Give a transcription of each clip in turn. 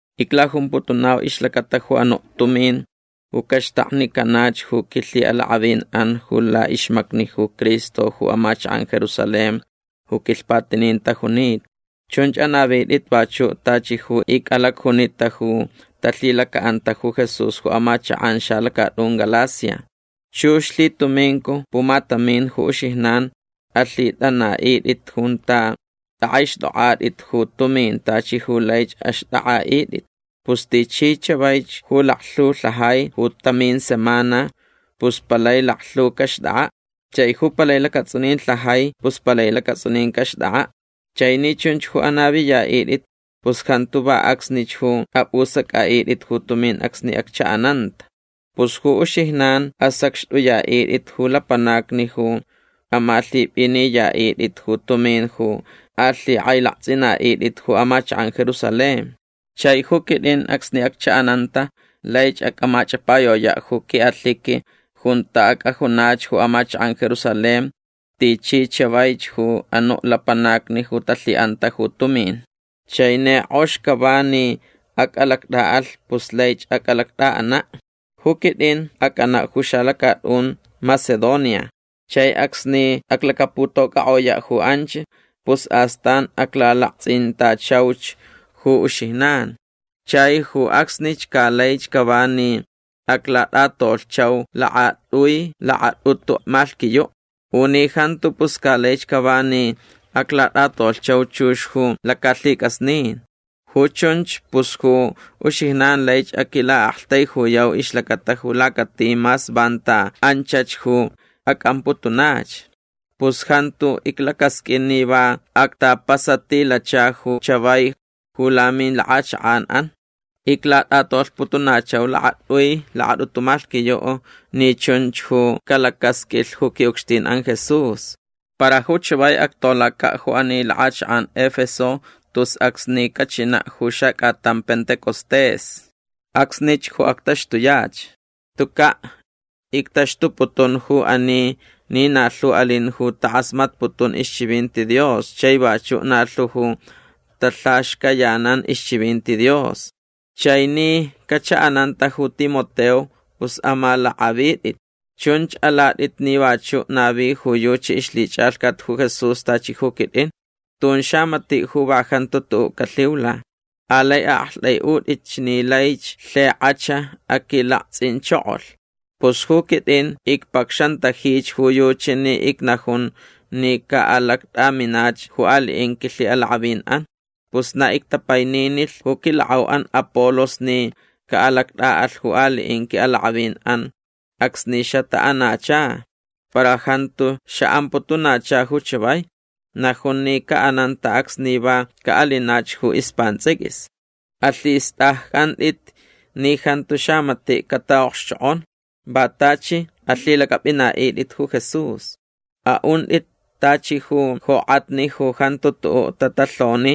Iclajumputunau ixlacata ju anuʼ tumin ju caxtaknicanach ju quilhiʼalakʼavin laʼixmacni ju Cristo ju amachakʼan Jerusalén ju quilhpatinin tajunita. Chunch anavitʼit vachuʼ tachi ju icʼalacjunita ju talhilacaʼanta ju Jesús ju amachakʼan xalacatʼun Galacia. Chux lhitumincu pumatamin ju uxijnan alhitʼanaʼitʼit junta tʼakʼaixtʼokʼatʼit ju tumin tachi ju laich axtʼakʼaʼitʼit. Pus tichi chavaich ju laklhu lhajai ju tamin semana pus palai laklhu caxtʼakʼaʼ. Chai ju palai lacatsʼunin lhajai pus palai lacatsʼunin caxtʼakʼaʼ. Chai ni chunch ju anaviyaʼitʼit pus jantu va acsnich ju apʼusacʼaʼitʼit ju tumin acsni acchaʼananta. Pus ju uxijnan asacxtʼuyaʼitʼit ju lapanacni ju amalhipʼiniyaʼitʼit ju tumin ju alhikʼailaktsʼinaʼitʼit ju amachakʼan Jerusalén. Chai ju quitʼin acsni acchaʼananta laich acʼamachʼapayoyaʼ ju quiʼalhiqui junta acʼajunach ju amachakʼan Jerusalén tichi chavaich ju anuʼ lapanacni ju talhiʼanta ju tumin. Chai ni kʼox cava ni acʼalactʼaʼalh pus laich acʼalactʼaʼanaʼ. Ju quitʼin acʼanaʼ ju xalacatʼun Macedonia. Chai acsni aclacaputocʼakʼoyaʼ ju anch pus astan aclalaktsʼintachauch ju uxijnan. Chai ju acsnich ca laich cava ni aclatʼatolhchau lakatʼui lakatʼutu malhquiyuʼ. U ni jantu pus ca laich cava ni aclatʼatolhchau chux ju lacalhicʼasnin. Ju chunch pus ju uxijnan laich aquilaʼaktaijuyau ixlacata ju lacati mas vanta anchach ju acʼamputunach. Pus jantu iclacasqʼuin ni va actapasatilacha ju chavai ju lamilakʼachakʼanʼan. Iclatʼatolhputunachau lakatʼui lakatʼutu malhquiyuʼ ni chunch ju calacʼasqʼuilh ju quiʼucxtin Jesús. Para ju chavai actolacaʼ ju ani lakʼachakʼan Efeso tus acsni cachinaʼ ju xacʼatan Pentecostés. Acsnich ju actaxtuyach. Tucaʼ ictaxtuputun ju ani ni na lhu alin ju takʼasmatputun ixchivinti Dios chai vachuʼ na lhu ju talhaxcayanan ixchivinti Dios. Chai ni cachaʼananta ju Timoteo pus amalakʼavitʼit. Chunch alatʼit ni vachuʼ navi ju yuchi ixlhichʼalhcat ju Jesús tachi ju quitʼin. Tun xamatiʼ ju va jantu tuʼuʼ calhiula. Alai aʼaktʼaiʼutʼitch ni lai lhikʼach aquilaktsʼinchokolh. Pus ju quitʼin icpacxantajich ju yuchi ni icnajun ni caʼalactʼaminach ju aliʼin quilhiʼalakʼavinʼan. Pus na ictapaininilh ju quilakʼauʼan Apolos ni caʼalactʼaʼalh ju aliʼin quiʼalakʼavinʼan acsni xataʼanacha. Para jantu xaʼamputunacha ju chavai. Najun ni caʼananta acsni va caʼalinach ju ispantsʼiquis. Alhistʼaccʼantʼit ni jantu xamatiʼ cataʼokxchokʼon. Va tachi alhilacʼapʼinaʼitʼit ju Jesús. Aʼuntʼit tachi ju jokʼatni ju jantu tuʼuʼ tatalhoni.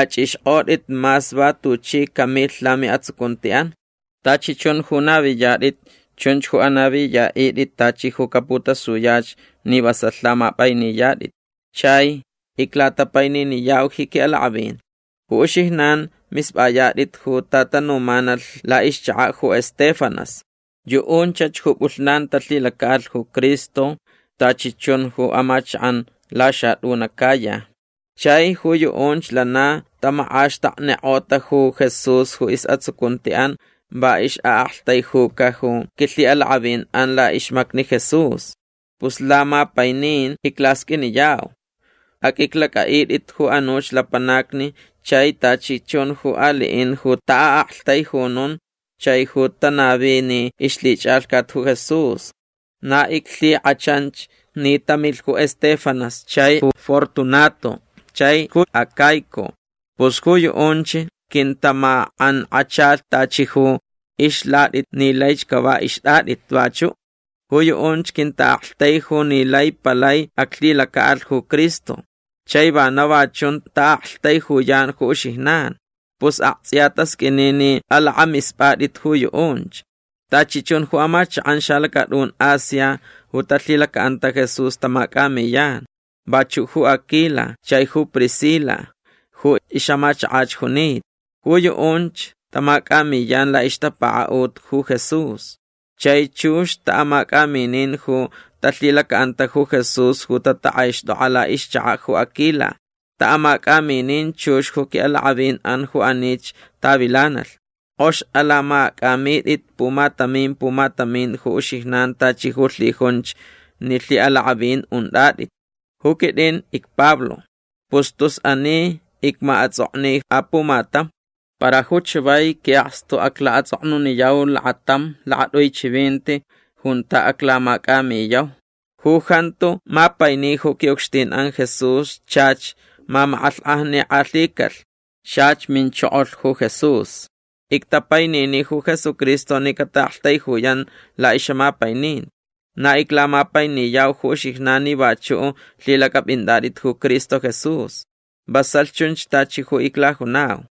Achʼixkʼotʼit mas va tuchi camilh lamiʼatsucuntiʼan. Tachi chun ju naviyatʼit chunch ju anaviyaʼitʼit tachi ju caputasuyach ni vasalh lamapʼainiyatʼit. Chai iclatapaininiyau ji quiʼalakʼavin. Ju uxijnan mispʼayatʼit ju tatanumanalh laʼixchakaʼ ju Estéfanas. Yuʼunchach ju pʼulhnan talhilacaʼalh ju Cristo tachi chun ju amachakʼan laxatʼun Acaya. Chai ju yuʼunch lana tamakʼaxtaknikʼota ju Jesús ju isʼatsucuntiʼan va ixʼaʼaktaijuca ju quilhiʼalakʼavinʼan laʼixmacni Jesús. Pus lamapainin iclasqʼuiniyau. Aqʼuiclacʼaʼitʼit ju anuch lapanacni chai tachi chun ju aliʼin ju taʼaʼaktaijunun chai ju tanavini ixlhichʼalhcat ju Jesús. Na iclhikʼachanch ni tamilh ju Estéfanas chai ju Fortunato chai ju Acaico. Pus ju yuʼunch quintamakʼankʼachalh tachi ju ixlatʼit ni laich cava ixtʼatʼit vachuʼ. Ju yuʼunch quintaʼaktaiju ni lai palai aclhilacaʼalh ju Cristo. Chai vana va chun taʼaktaijuyan ju uxijnan. Pus aktsʼiya tasqʼuini ni alakʼamispʼatʼit ju yuʼunch. Tachi chun ju amachakʼan xalacatʼun Asia ju talhilacaʼanta Jesús tamacʼamiyan. Vachuʼ ju Aquila chai ju Priscila ju ixʼamachakach junita. Ju yuʼunch tamacʼamiyan laʼixtapakaʼut ju Jesús. Chai chux taʼamacʼaminin ju talhilacaʼanta ju Jesús ju tatakʼaixtʼokʼa laʼixchakaʼ ju Aquila. Taʼamacʼaminin chux ju quiʼalakʼavinʼan ju anich tavilanalh. Kʼox alamacʼamitʼit pumatamin pumatamin ju uxijnan tachi ju lhijunch ni lhiʼalakʼavin untʼatʼit. Ju quitʼin icPablo. Pus tus ani icmaʼatsʼokni apumatam. Para ju chavai quiʼakstu aclaʼatsʼoknuniyau lakatam lakatʼui chivinti junta aclamacʼamiyau. Ju jantu mapaini ju quiʼucxtinʼan Jesús chach mamakʼalhkʼajnikʼalhicalh. Chach minchokolh ju Jesús. Ictapainini ju Jesucristo ni cataʼaktaijuyan laʼixʼamapaininti. Na iclamapainiyau ju uxijnan ni vachuʼ lhilacʼapʼintʼatʼit ju Cristo Jesús. Vasalh chunch tachi ju iclajunau.